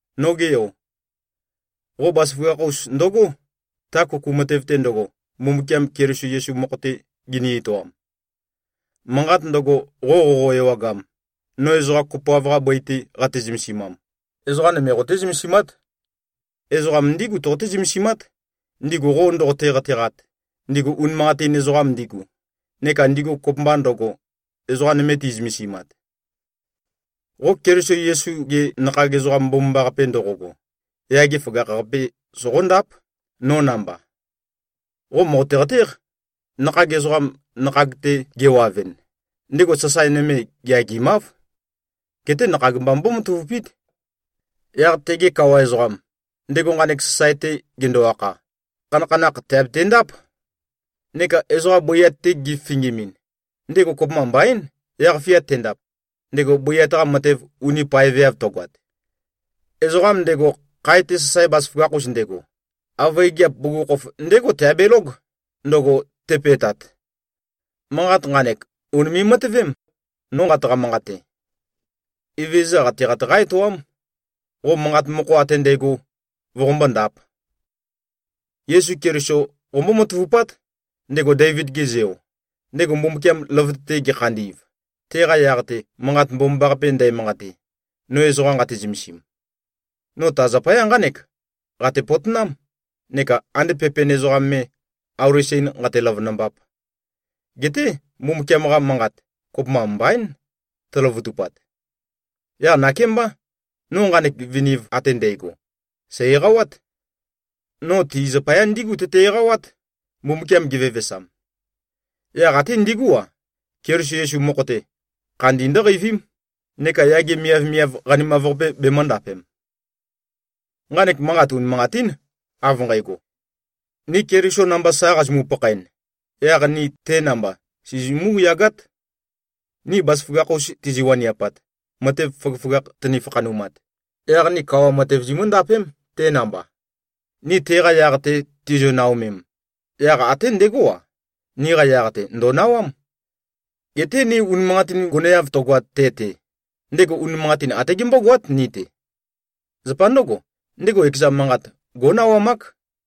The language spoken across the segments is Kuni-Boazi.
Noge yo! Qo bazaføgakh-us ndøgó, ta kuku matev-te ndøgo, Mbumbukiam Keliso Yesu mokho-te gini-etoam. Manqat ndøgo, qo qoqo-ewagam, no ezoqa kopoav-qa bøi-te qate-zømesimam, ezoqa nøme qoté-zømesimát. Ezoqa ndígu toqoté-zømesimát, ndigu qo ndoqote-qateqat, ndigu unimanqatin ezoqam ndigu, neka ndigu kopømba ndøgo, ezoqa nøme ti꞉zømesimat. Qo Keliso Yesu-ge nakhag ezoqam mbomambaqape ndoqogo, yage føgakh-qape soqóndáp, no namba. Qo mòqote-qatéq. Nakhag ezoqam nakhag-te gewavɨn, ndego sasae nøme geagimáv. Geté nakhag mba mbómatavupít. Yaq tege kawa ezoqam, ndego nqanek sasae-te gendo-akha, khanakhanakh tèabetendáp. Neka ezoqa bøiat-te gefifingimin, ndego kopømba mbaín, yaq-fia tendap, ndego bøiat-qa matev uni paeveav tøgoat. Ezoqam ndego, khae-te sasae bazaføgakh-us ndego, avøe gigiap bugukhokhof ndégo teabelóg, ndøgo tepe꞉tat. Manqat nqanek ùnime꞉-matøvém, no nqataqa-manqate. Evezøza qateqat qá-etoám, qo manqa mokho ate ndægo voqombó-ndāp. Yesu Keliso qombó-matavupát, ndego Deivid-ge zeo, ndego Mbumbukiam løvøte-te gekhandi꞉v, teqa yaq-te Manqat Mbomambaqape ndæmanqate, no ezoqa nqate-zømesim. No ta zapaya nqánek qate-potonám, neka ande pepen ezoqam me, auli sen nqate-løvønømbap. Geté Mbumbukiam-qa manqat, kopømba mbaín tøløvøtupat. Yaq nakémbá, no nqanek viniv ate ndægo, sæ̀-eqawát. No ti zapaya ndígu tøte-eqawát, Mbumbukiam gevevesam. Yaq até ndigú-a, Keliso Yesu mokho-te, khandi ndǿqeivím, neka yage miavmiav qanimav-qape bemø̄ndapem. Nqanek manqat unimanqatín, av nqægo: Ni Keliso namba sa qazimu-pakhaen, yaq ni te namba sizimú-yagát. Ni bazaføgakh-us tizi-waniapat, matev føgøføgakh tøni-fakhanumat, yaq ni kawa matev zimǿndapém, te namba. Ni teqa yaq-te tizio-naomem, yaq até ndegó-a, niqa yaq-te, ndò꞉nawám. Geté ni unimanqatin goneav tøgoat te-te, ndego unimanqatin até gembógoát ni-te. Zapa ndǿgo, ndego ekeza manqat gó꞉nawamák.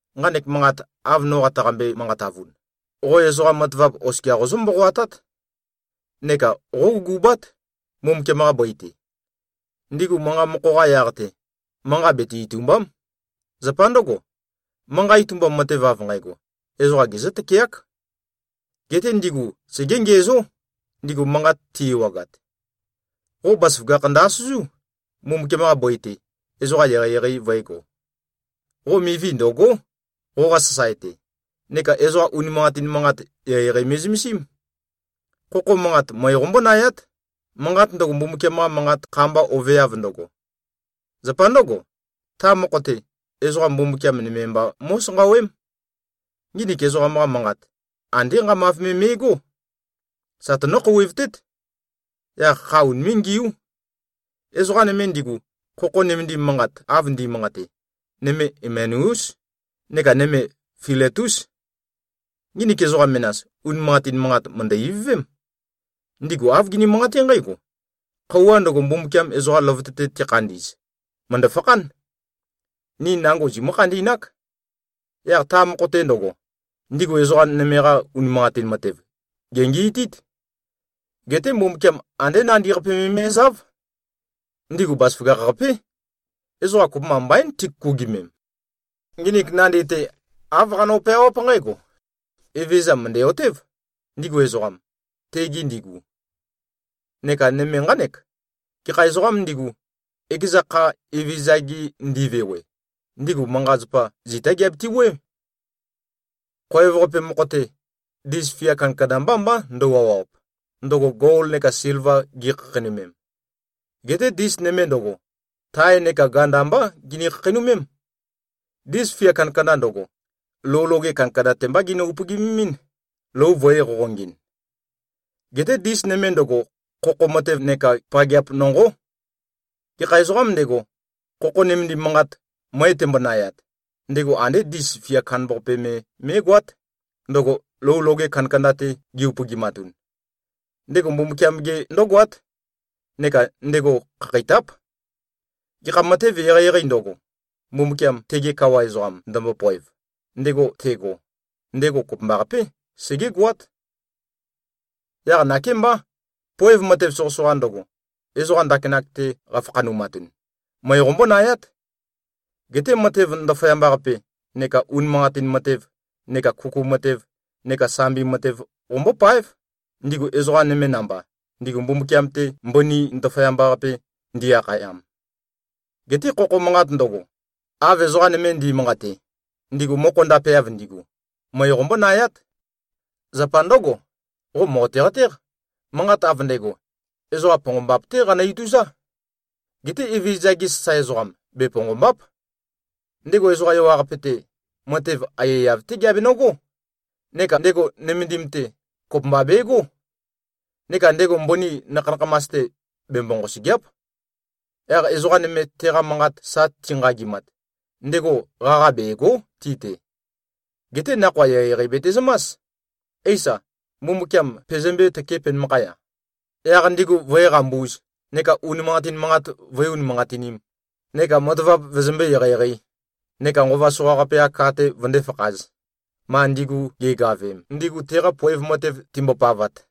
Nqanek manqat, av no qataqambe-manqatavun, qo ezoqa matavap oskia qozǿ-mboqoatát. Neka qógugubát, Mbumbukiam-qa bøi-te. Ndigu manqa mokho-qa yaq-te, manqa bete-itùmba᷄m. Zapa ndǿgo, manqa itumbam matev av nqægo, ezoqa gezǿ-tøkeák. Geté ndigu segé-ngiæzó, ndigu manqat ti-ewagat. Qo bazaføgakh ndø-asøzú, Mbumbukiam-qa bøi-te, ezoqa eqeieqei vø̄ego. Qo mivi ndø̀go᷄, qoqa sasae-te, neka ezoqa unimanqatin manqat eqeieqei me꞉zømesím. Khokho manqat, møe qombónayát, manqat ndøgo, Mbumbukiam-qa Manqat kha-mba oveav ndøgo. Zapa ndǿgo, ta mokho-te, ezoqa Mbumbukiam nøme mba mó꞉sanqawém. Nginik ezoqam-qa manqat, andé nqamav me me꞉gó. Sa tønǿ-khouwevtét. Yaq kha unimé꞉-ngiú. Ezoqa nøme ndigu, khokho nømendim manqat av ndi꞉manqate, nøme Imenæús neka nøme Filetús. Nginik ezoqa menas, unimanqatin manqat mø̀ndø-ivøvém. Ndigu āv gini-manqaté nqǽgo, “Khøuwa ndøgo, Mbumbukiam ezoqa løvøte-te tekhandi꞉z, mø̀ndø-fakhán. Ni nango zimǿ-khandi꞉nák.” Yaq ta mokho-te ndøgo, ndigu ezoqa nøme-qa unimanqatin matev, gèngi꞉tít. Geté Mbumbukiam andé nandi-qapi me me꞉záv. Ndigu bazaføgakh-qapé. Ezoqa kopømba mbaín tikukugimem. Nginik nandi-te āv qano-peawáp nqǽgo: “Evezøza mø̀ndæ-otév, ndigu ezoqam, tegi ndigu.” Neka nøme nqánek: “Gekha ezoqām ndigu, ekeza kha Evezøza-gi ndi꞉vewe, ndigu manqa-zapa zitá giabiti-wuøé.” Khoev-qape mokho-te, ndis fia kandakanda mbá mbá ndøu-awap, ndøgo gol neka silva gi꞉khakheinømem. Geté ndis nøme ndøgo, tae neka ganda mbá gini-khakheinømém. Ndis fia kandakanda ndøgo, lou loge kandakanda-te mbá ginø-upøgimín, lou vø̄e-qoqongɨn. Geté ndis nøme ndøgo, khokho matev neka pageap nonqó. Gekha ezoqām ndego, khokho nømendim manqat møe tembonayat, ndego andé ndis fia kandambaqape me mé꞉goát, ndøgo lou loge kandakanda-te gi-upøgimatun. Ndego Mbumbukiam-ge ndǿgoát. Neka ndego khakheitáp. Gekha matev eqeieqeī ndøgo, Mbumbukiam, tege Kawa ezoqam, ndømbopoev, ndego tego, ndego kopømbaqapé, segégoát. Yaq nakémbá, poev matev soqøsoqa ndøgo, ezoqa ndakinak-te qafakhanumatun, møe qombónayát. Geté matev ndaføyamba-qape neka unimanqatin matev neka kuku matev neka sambi matev qombópáev, ndigu ezoqa nøme namba, ndigu Mbumbukiam-te mbøni ndaføyamba-qape ndi꞉-akhayam. Geté khokho manqat ndøgo, av ezoqa nøme ndi꞉manqate, ndigu mokho ndapeav ndigu, møe qombónayát. Zapa ndǿgo, qo mòqote-qatéq, manqat av ndægo, ezoqa ponqombap-té qanø-ituzá. Geté Evezøza-ge sasae ezoqam, beponqòmba᷄p. Ndego ezoqa ewaqape-te, matev aiyaiyav-té geabenøgó. Neka ndego nømendim-te, kopømba begó. Neka ndego mbøni nakha-nakhamas-te, bembo-nqosø̀gea᷄p. Yaq ezoqa nøme, teqa manqat sa tinqagimat, ndego qaqa bègo᷄ ti-te. Geté nakhoa eqeieqei betezømás. Eisa, Mbumbukiam pezømbé-tøkē penømakhaya, yaq ndigu vǿe-qambūz neka unimanqatin manqat vǿe-unimanqatinīm, neka matavap vøzømbé-eqeieqeī neka nqova soqaqape-qa ka-te vøndé-fakhāz, ma ndigu ge꞉gavem, ndigu teqa poev matev timbopavat.